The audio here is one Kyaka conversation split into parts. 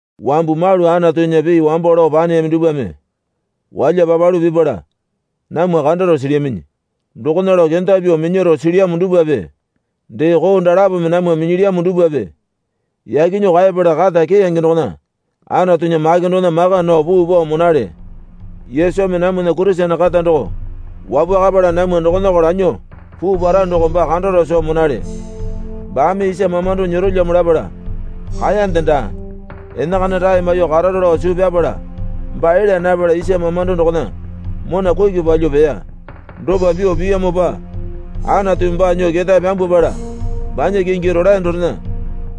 Wambu malu Anatunya pii wambo lao paneyami dupwame walya papalu pipala namwa kandaro silyaminyi. Dokona lao kenda pyuo minyaro silyamo dupwape dee koo dalapome namwa minyilyamo dupwape yaki nyuo kaepala kata keyange dokona Anatunya make dokona maka nao puu pao monale. Yesumi namwana Kurisene kata doko wapwakapala namwa dokonako lanyuo puu para doko baa kandaro soo monale. Baame isa mamando nyerolyamo lapala kaeyande daa. Enakana rae maiyuo kararo lao suu pyapala baa elya napala isa mamando dokona mona kuki palyuo peya. Dopa pyuo piyamopa Anatumi baa nyuo ketae pyambwapala banya kingi rolae dorena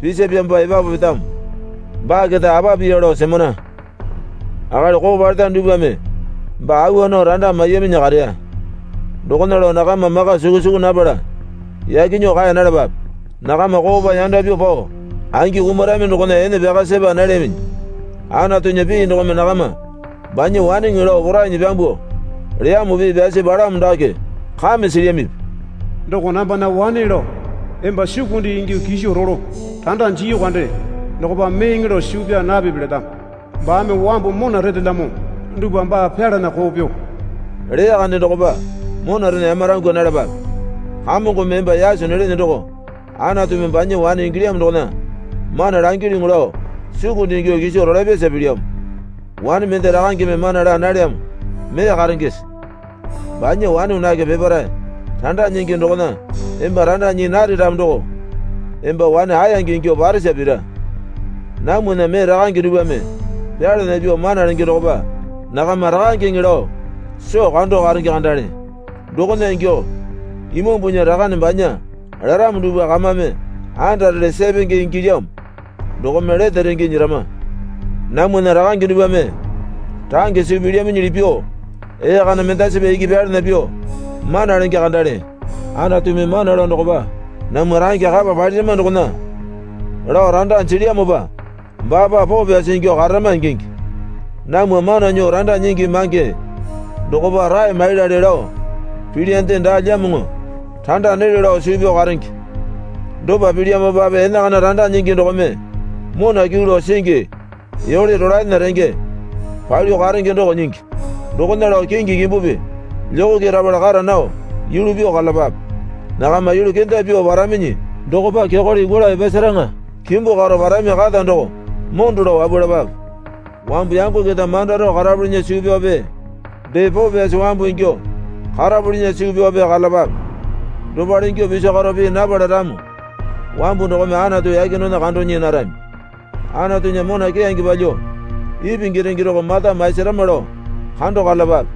pisapyamopa epapu petamo. Baa keta apa piya lao semana. Akali koo paleta dupwame baa awa nao randa maiyaminyi kareya. Dokona lao nakama maka suku suku napala yaki nyuo kaeya nalapape. Nakama koopa yanda pyuo pao angi kumarami dokona ene pyaka sepa nalyaminyi. Anatunya pii dokome nakama banya waneŋe lao porainyi pyambuo leyamo pii pyasi palamo dake kame silyamipi? Doko nambana wane lao emba sukunde ingyuo kiso rolo randa jiyu kande dokopa meeŋe lao suu pyaa napipi letamo. Baame wambu mona retelyamo dupwa baa pyalana koo pyuo leya kande dokopa monarena yamarangwa nalapape. Kamongome emba yaso nelene doko Anatumi banya wane ingilyamo dokona mana langilyuŋu lao sukunde ingyuo kiso rolapyasa pilyamo. Wane mende rakangeme mana laa nalyamo mee karengese? Banya wane wanake peparae randa nyingi dokona emba randa nyii nare ramo doko emba wane aeyange ingyuo parasa pira. Namwana mee rakange dupwame pyalana pyuo mana lenge dokopa nakama rakangeŋe lao soo kando karenge kandale. Dokona ingyuo Imambunya Rakane banya laramo dupwa kamame andarele sepenge ingilyamo. Dokome lete renge nyerama. Namwana rakange dupwame range suu pilyaminyili pyuo ee kana mendasipa iki pyalana pyuo mana lenge kandale. Anatumi mana lao dokopa namwa range kapa palirama dokona lao randa jilyamopa baapa poo pyasi ingyuo kararama ingingi. Namwa mana nyuo randa nyingi mange dokopa rae maiyalale lao pilyande daalyamoŋo randa nelyo lao suu pyao karenge. Dopa pilyamopape enakana randa nyingi dokome mona kyuu lao singi yole rolaena renge palyuo karenge doko nyingi. Dokona lao kingi kimbupi lyokokerapala kara nao yulu pyuo karalapape. Nakama yulu kenda pyuo paraminyi dokopa kyokole yukwala epasaraŋa kimbu karo parami kata doko mondo lao wapwalapape. Wambu yango keta manda rao karapulinya suu pyaope dee poo pyasi wambu ingyuo karapulinya suu pyaope karalapape. Dopale ingyuo piso karo pii napala ramo wambu dokome Anatu yake dokona kando nyii narami. Anatunya mona keyange palyuo ipingi renge doko mata maisarama lao kando karalapape.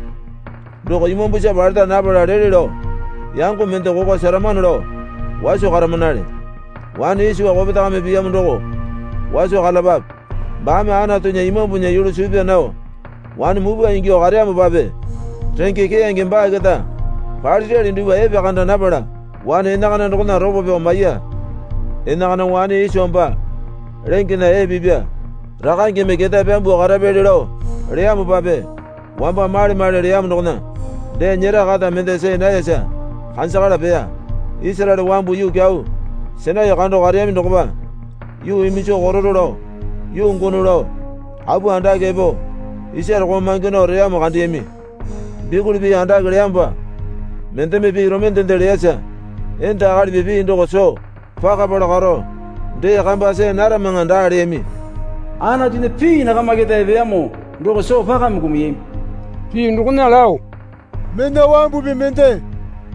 Doko imambusa paleta napala lele lao yango mende kokwa seramano lao waso karamanale. Wane Iso kopetame piyamo doko waso karalapape. Baame Anatunya Imambunya yulu suu pyaa nao wane mupwa ingyuo kareyamopape renge keyange baa keta palirali dupwa epekanda napala wane enakana dokona ropo pyao maiya. Enakana wane Iso baa lengena ee pipa rakangeme ketae pyambuo karapyali lao leyamopape wamba male male leyamo dokona dee nyera kata mende see nayasa kanjakala peya. Isaraele wambu yuu kyau Sainai kando kareyami dokopa yuu iminjo kotoro lao, yuu gono lao apu andake epo isare koomange nao reyamo kandeyami. Bikuli pii andake leyamopa mendeme pii romendende leyasa enda akalipi pii doko soo pakapala karo dee kamba see naramaŋa daa leyami. Anatunya pii nakama keta epeyamo doko soo pakame kumuyami. Pii dokona lao, Mena wambupi mende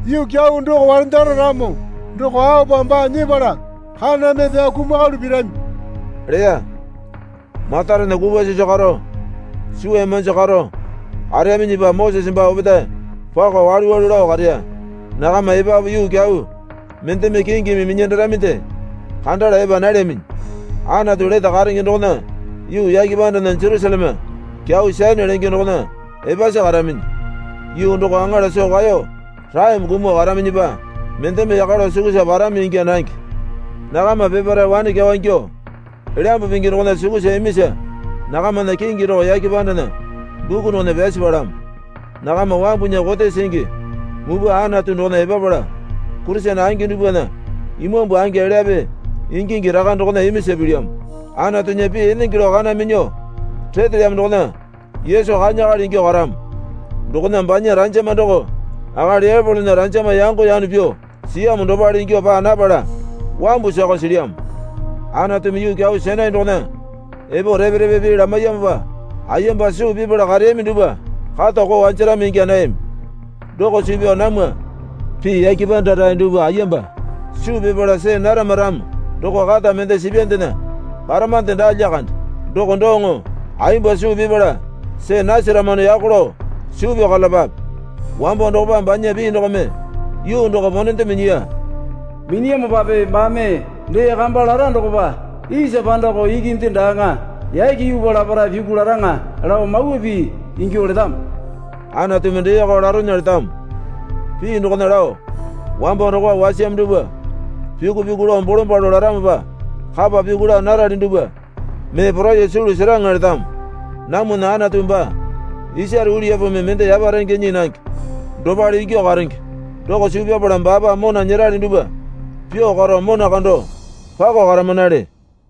yuu kyau doko warendara ramo doko aopa baa nyepala kaname pyao kumakalu pirami leya. Matarena kupwa sisu karo suwa yamanji karo kareyaminyipa Mosese baa opetae pako walu walu lao kareya. Nakama epapu yuu kyau mendeme kingimi minyandaraminde kandala epa nalyaminyi. Anatu lete karenge dokona yuu yake pandana Jerusaleme kyau Sayone lenge dokona epasi karaminyi. Yuu doko aŋala soo kaeyo raeme kumuo karaminyipa mendeme yaka lao sukusa parami ingya nange. Nakama peparae wane kyawa ingyuo Elyambu Pingi dokona sukusa imisa nakamana kingi doko yake pandana buku dokona pyasi palamo. Nakama Wambunya Kote Singi Mupwa Anatu dokona epapala Kurisene angi dupwana imambu angi elyape ingingi raka dokona imisa pilyamo. Anatunya pii enenge lao kana minyuo retelyamo dokona Yesu kanya akali ingyuo karamo. Dokona banya ranjama doko akali Epolona ranjama yango yano pyuo siyamo dopale ingyuo paa napala wambu sakao silyamo. Anatumi yuu kyau Sainai dokona epo repe repe pii lamaiyamopa ayemba suu pipala kareyami dupwa kata koo wanjarami ingya nayami. Doko suu pyao namwa pii yake panda rae dupwa ayemba suu pipala see narama ramo doko kata mende sipyandena paramande daa lyakande. Doko doŋo ayemba suu pipala see nasaramano yako lao suu pyao karalapape. Wambo dokopa banya pii dokome yuu doko ponende minyiya. Minyiyamopape baame dee kamba lara dokopa isa pandako ikinde daaŋa yake yuupa laparae pyuku laraŋa lao mawa pii ingyuo letamo. Anatumi deeko laronya letamo pii dokona lao, Wambo dokopa wasiyamo dupwa pyuku pyuku lao bolombalo laramopa kapa pyuku laa narali dupwa mee poraiyuo sulu seraŋa letamo. Namwana Anatu baa isare uliyapumi mende yaparenge nyii nange dopale ingyuo karenge. Doko suu pyapala baapa mona nyerali dupwa pyuo karo mona kando pako karamanale.